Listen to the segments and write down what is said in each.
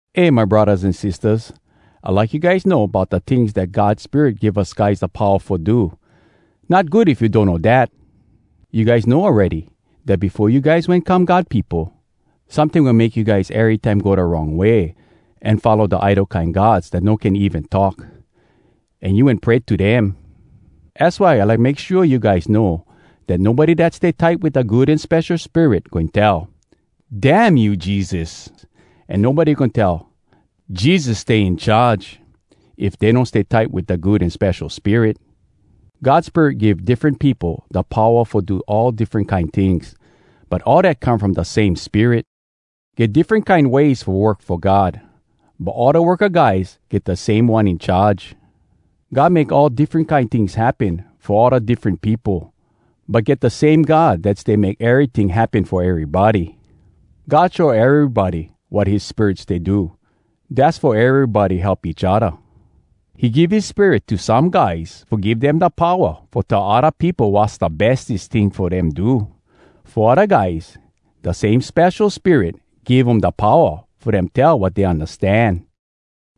Eh, my braddahs an sistahs, I like you guys know bout da tings dat God Spirit give us guys da powa fo do. Not good if you donno dat! You guys know awready, dat befo you guys wen come God peopo, someting wen make you guys erytime go da wrong way an follow da idol kine gods dat no can even talk, an you wen pray to dem. Az why I like make shua you guys know dat nobody dat stay tight wit da Good An Spesho Spirit goin tell, “Dam you, Jesus!” An nobody goin tell, “Jesus stay in charge!” if dey no stay tight wit da Good An Spesho Spirit. God Spirit give diffren peopo da powa fo do all diffren kine tings, but all dat come from da same Spirit. Get diffren kine ways fo work fo God, but all da worka guys get da same One In Charge. God make all diffren kine tings happen fo all da diffren peopo, but get da same God dat stay make eryting happen fo erybody. God show erybody wat his Spirit stay do, dass fo erybody help each odda. He give his Spirit to some guys fo give dem da powa fo tell odda peopo wass da bestes ting fo dem do. Fo odda guys, da same Spesho Spirit give um da powa fo dem tell wat dey undastan.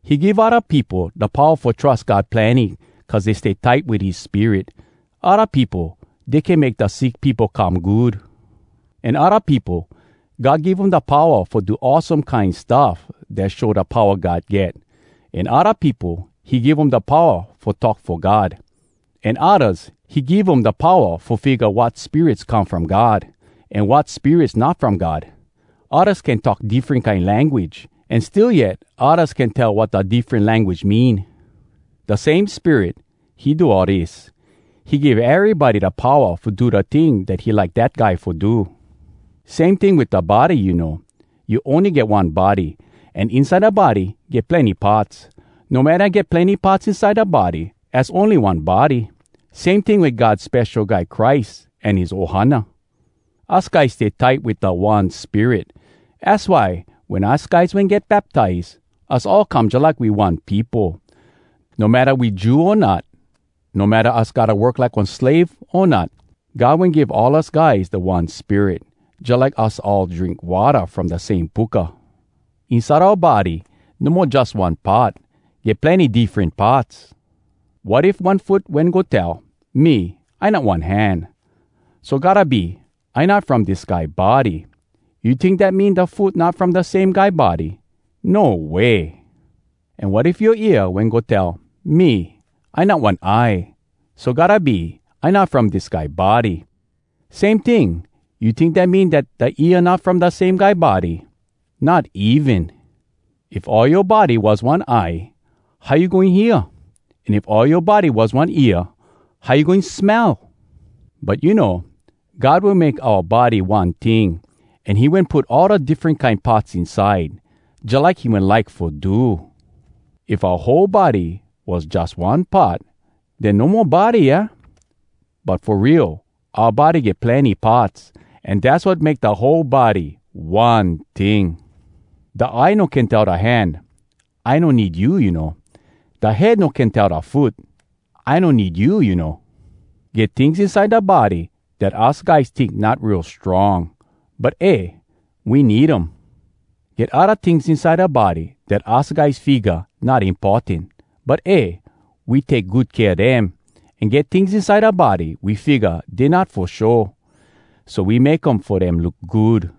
He give odda peopo da powa fo trus God plenny cuz dey stay tight wit his Spirit. Odda peopo, dey can make da sick peopo come good. An odda peopo, God give um da powa fo do awesome kine stuff dat show da powa God get. An odda peopo, he give um da powa fo talk fo God, an oddas, he give um da powa fo figga wat spirits come from God an wat spirits not from God. Oddas can talk diffren kine language. An still yet oddas can tell wat da diffren language mean. Da same Spirit, he do all dis. He give erybody da powa fo do da ting dat he like dat guy fo do. Same ting wit da body, you know. You ony get one body, an inside da body, get plenny parts. No matta get plenny parts inside da body, az ony one body. Same ting wit God Spesho Guy Christ an his ohana. Us guys stay tight wit da one Spirit. Az why, wen us guys wen get baptize, us all come jalike we one peopo. No matta we Jew o not, no matta us gotta work like one slave o not, God wen give all us guys da One Spirit, jalike us all drink watta from da same puka. Inside oua body, no mo jus one part—get plenny diffren parts. Wat if one foot wen go tell, “Me, I not one hand, so gotta be, I not from dis guy body!” You tink dat mean da foot not from da same guy body? No way! An wat if yoa ear wen go tell, “Me, I not one eye, so gotta be, I not from dis guy body!” Same ting, you tink dat mean dat da ear not from da same guy body? Not even! If all yoa body was one eye, how you goin hear? If all yoa body was one ear, how you goin smell? But you know, God wen make oua body one ting, an he wen put all da diffren kine parts inside, jalike he wen like fo do. If oua whole body was jus one part, den no mo body, aah? But fo real, oua body get plenny parts, an dass wat make da whole body one ting. Da eye no can tell da hand, “I no need you, you know!” Da head no can tell da foot, “I no need you, you know!” Get tings inside da body dat us guys tink not real strong, but eh! we need um. Get odda tings inside da body dat us guys figga not importan, but eh! we take good kea dem. An get tings inside da body, we figga dey not fo show, so we make um fo dem look good.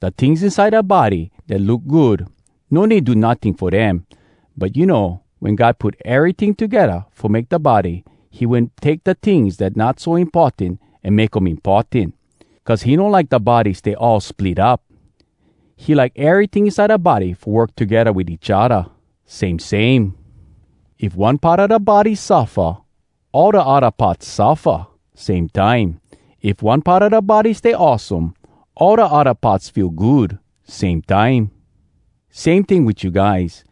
Da tings inside da body dat look good, no need do notting fo dem. But you know, wen God wen put eryting togedda fo make da body, he wen take da tings dat not so importan an make um importan, cuz he no like da body stay all split up. He like eryting inside da body fo work togedda wit each odda, same same. If one part a da body suffa, all da odda parts suffa, same time. If one part a da body stay awesome, all da odda parts feel good, same time. Same ting wit you guys.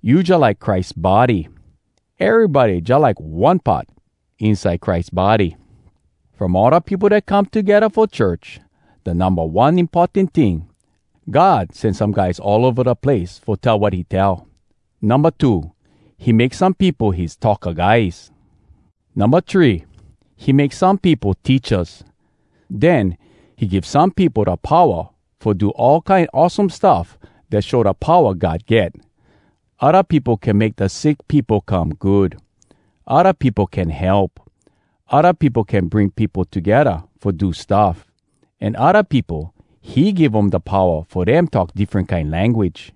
You jalike Christ body. Erybody jalike one part inside Christ body. From all da peopo dat come togedda fo church, da numba one importan ting, God sen some guys all ova da place fo tell wat he tell. Numba two, he make some peopo his talka guys. Numba three, he make some peopo teachas. Den, he give some peopo da powa fo do all kine awesome stuff dat show da powa God get. Odda peopo can make da sick peopo come good. Odda peopo can help. Odda peopo can bring peopo togedda fo do stuff. An odda peopo, he give um da powa fo dem talk diffren kine language.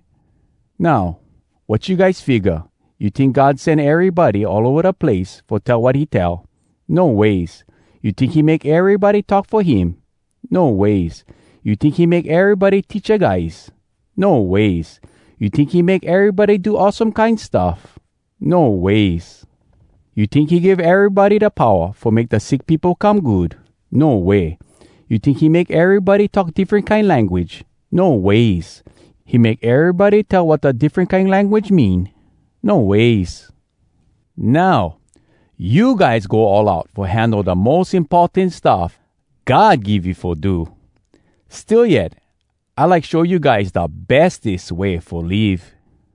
Now, wat you guys figga? You tink God sen erybody all ova da place fo tell wat he tell? No ways. You tink he make erybody talk fo him? No ways. You tink he make erybody teacha guys? No ways. You tink he make erybody do awesome kine stuff? No ways. You tink he give erybody da powa fo make da sick peopo come good? No way. You tink he make erybody talk diffren kine language? No ways. He make erybody tell wat da diffren kine language mean? No ways. Now, you guys go all out fo handle da mos importan stuff God give you fo do. Still yet, I like show you guys da bestes way fo live: